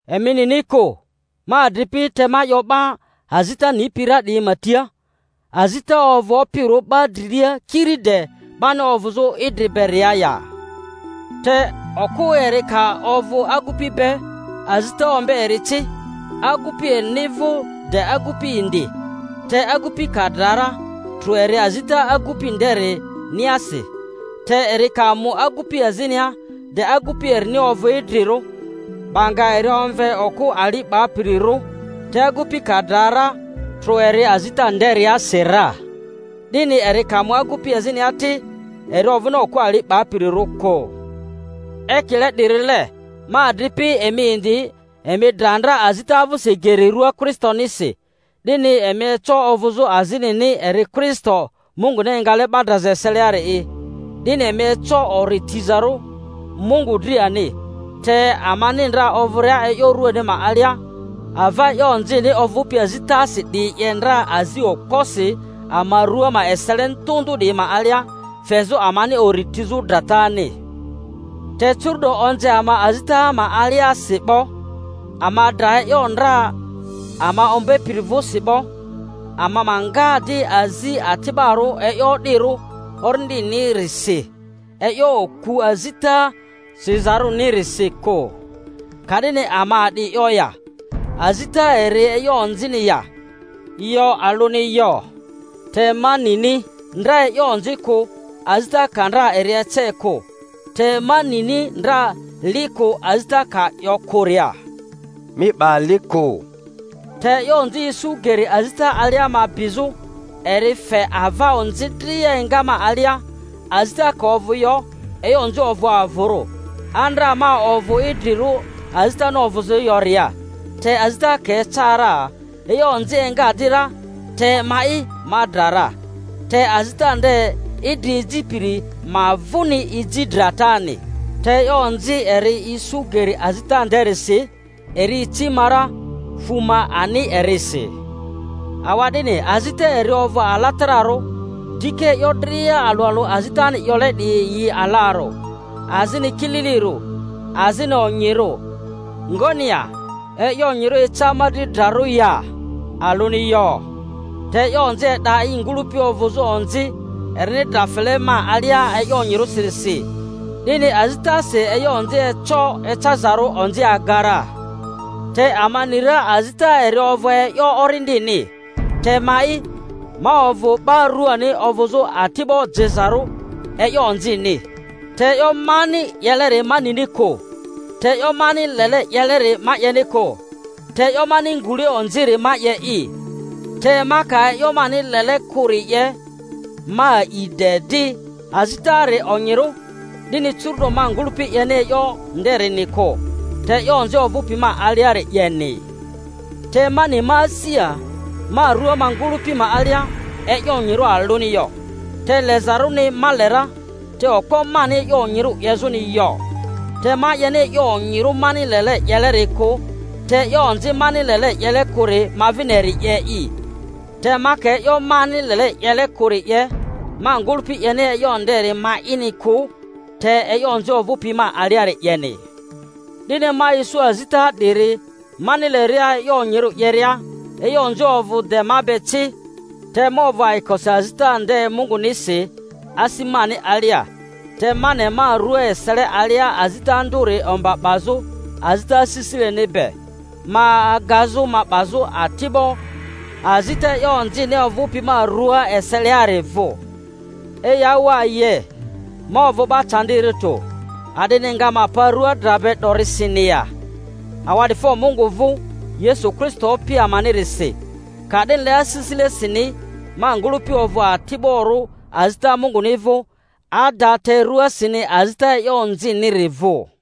Emi nini kᴜ, ma adripi—te ma 'yo 'ba azita nipi ra 'diyi ma tia— azita ovᴜ opirᴜ 'ba drilia kiri de' bani ovᴜzᴜ idri beria ya? Te okᴜ eri ka ovᴜ agupi be, azita ombe eri ci agupi erini vᴜ de agupi indi; te agupi ka dra ra, trᴜ eri azita agupi nderi-niasi. Te eri ka mu agupi azinia de agupi erini ovᴜ idrirᴜ, 'ba nga eri omve okᴜ ali 'bapirirᴜ. Te agupi ka dra ra, trᴜ eri azita nderiasi ra, 'dini eri ka mu agupi azinia ti, eri ovᴜni okᴜ ali 'bapirirᴜ kᴜ. Ekile 'dirile, ma adripi, emi indi emi dra ndra azita vᴜsi geri rua Kristonisi, 'dini emi eco ovᴜzᴜ azinini, eri Kristo Munguni engale 'ba draza eseliari'i, 'dini emi eco ori tizarᴜ Mungu dri ani. Te amani ndra ovᴜria e'yo ruani ma alia, ava e'yo onzini ovᴜpi azitasi 'diyi 'ye ndra azi okposi ama rᴜa ma esele ndᴜ ndᴜ 'diyi ma alia, fezᴜ amani ori tizᴜ dratani. Te curu’do onze ama azita ma aliasi 'bo, ama dra e'yo ndra ama ombepiri vᴜsi 'bo, ama ma nga di azi ati'barᴜ e'yo o'dirᴜ orindini-risi, e'yo oku azita sizarᴜnirisi kᴜ. Ka'dini ama a'di 'yo ya? Azita eri e'yo onzini ya? Yo, alᴜni yo! Te ma nini ndra e'yo onzi kᴜ, azita ka ndra eri ece kᴜ. Te ma nini ndra li kᴜ, azita ka 'yo kᴜria, Mi 'ba li kᴜ. Te e'yo onzi isu geri azita alia ma bizᴜ, eri fe ava onzi dria enga ma alia. Azita ka ovᴜ yo, e'yo onzi ovᴜ avᴜrᴜ. Andra ma ovᴜ idrirᴜ azitani ovᴜzᴜ yoria, te azita ka eca ra e'yo onzi enga di ra, te ma'i ma dra ra; te azita nde idri ejipiri, ma vᴜni eji dratani. Te e'yo onzi eri isu geri azita nderisi, eri ici ma ra, fᴜ ma ani erisi. Awa'dini, azita eri ovᴜ alatararᴜ, dika e'yo dria alᴜ alᴜ azitani 'yole 'diyi yi alarᴜ, azini kililirᴜ, azini onyirᴜ. Ngoni ya? E'yo onyirᴜ eca ma dri drarᴜ ya? Alᴜni yo! Te e'yo onzi e'da i ngᴜlᴜpi ovᴜzᴜ onzi erini dra fele ma alia e'yo onyirᴜsirisi, 'dini azitasi e'yo onzi eco ecazarᴜ onzi aga ra. Te ama ni ra azita eri ovᴜ e'yo orindini; te ma'i, ma ovᴜ 'ba ruani, ovᴜzᴜ ati'bo jezarᴜ e'yo onzi-ni. Te e'yo mani 'yeleri ma nini kᴜ. Te e'yo mani lele 'yeleri ma 'yeni kᴜ, te e'yo mani ngule onziri ma 'ye'i. Te ma ka e'yo mani lele kᴜri 'ye, ma a'i de 'di, azitari onyirᴜ. 'Dini curu'do ma ngᴜlᴜpi 'yeni e'yo nderini kᴜ, te e'yo onzi ovᴜpi ma aliari 'yeni. Te ma ni ma asia, ma rua ma ngᴜlᴜpi ma alia e'yo onyirᴜ alᴜni yo. Te lezarᴜni, ma le ra, te okpo mani e'yo onyirᴜ 'yezᴜni yo. Te ma 'yeni e'yo onyirᴜ mani lele 'yeleri kᴜ, te e'yo onzi mani lele 'yele kᴜri ma vini eri 'ye'i. Te ma ka e'yo mani lele 'yele kᴜri 'ye, ma ngᴜlᴜpi 'yeni e'yo nderi ma'ini kᴜ, te e'yo onzi ovᴜpi ma aliari 'yeni. 'Dini ma isu azita 'diri, mani leria e'yo onyirᴜ 'yeria, e'yo onzi ovᴜ de ma be ci. Te ma ovᴜ ayikosi azita nde Mungunisi asi mani alia, te ma ne ma rᴜa esele alia azita ndᴜri omba 'bazᴜ azita asisileni be, ma agazᴜ ma 'bazᴜ ati'bo azita e'yo onzini ovᴜpi ma rua eseliari vᴜ. Eyawaye! Ma ovᴜ 'ba candirᴜ tᴜ. A'dini nga ma pa rua dra be 'dorisiin ya? Awa'difo Mungu vᴜ Yesu Kristo Opi amanirisi! Ka'dinile, asisilesini ma ngᴜlᴜpi ovᴜ ati'borᴜ azita Munguni vᴜ ada, te ruasini azita e'yo onziniri vᴜ.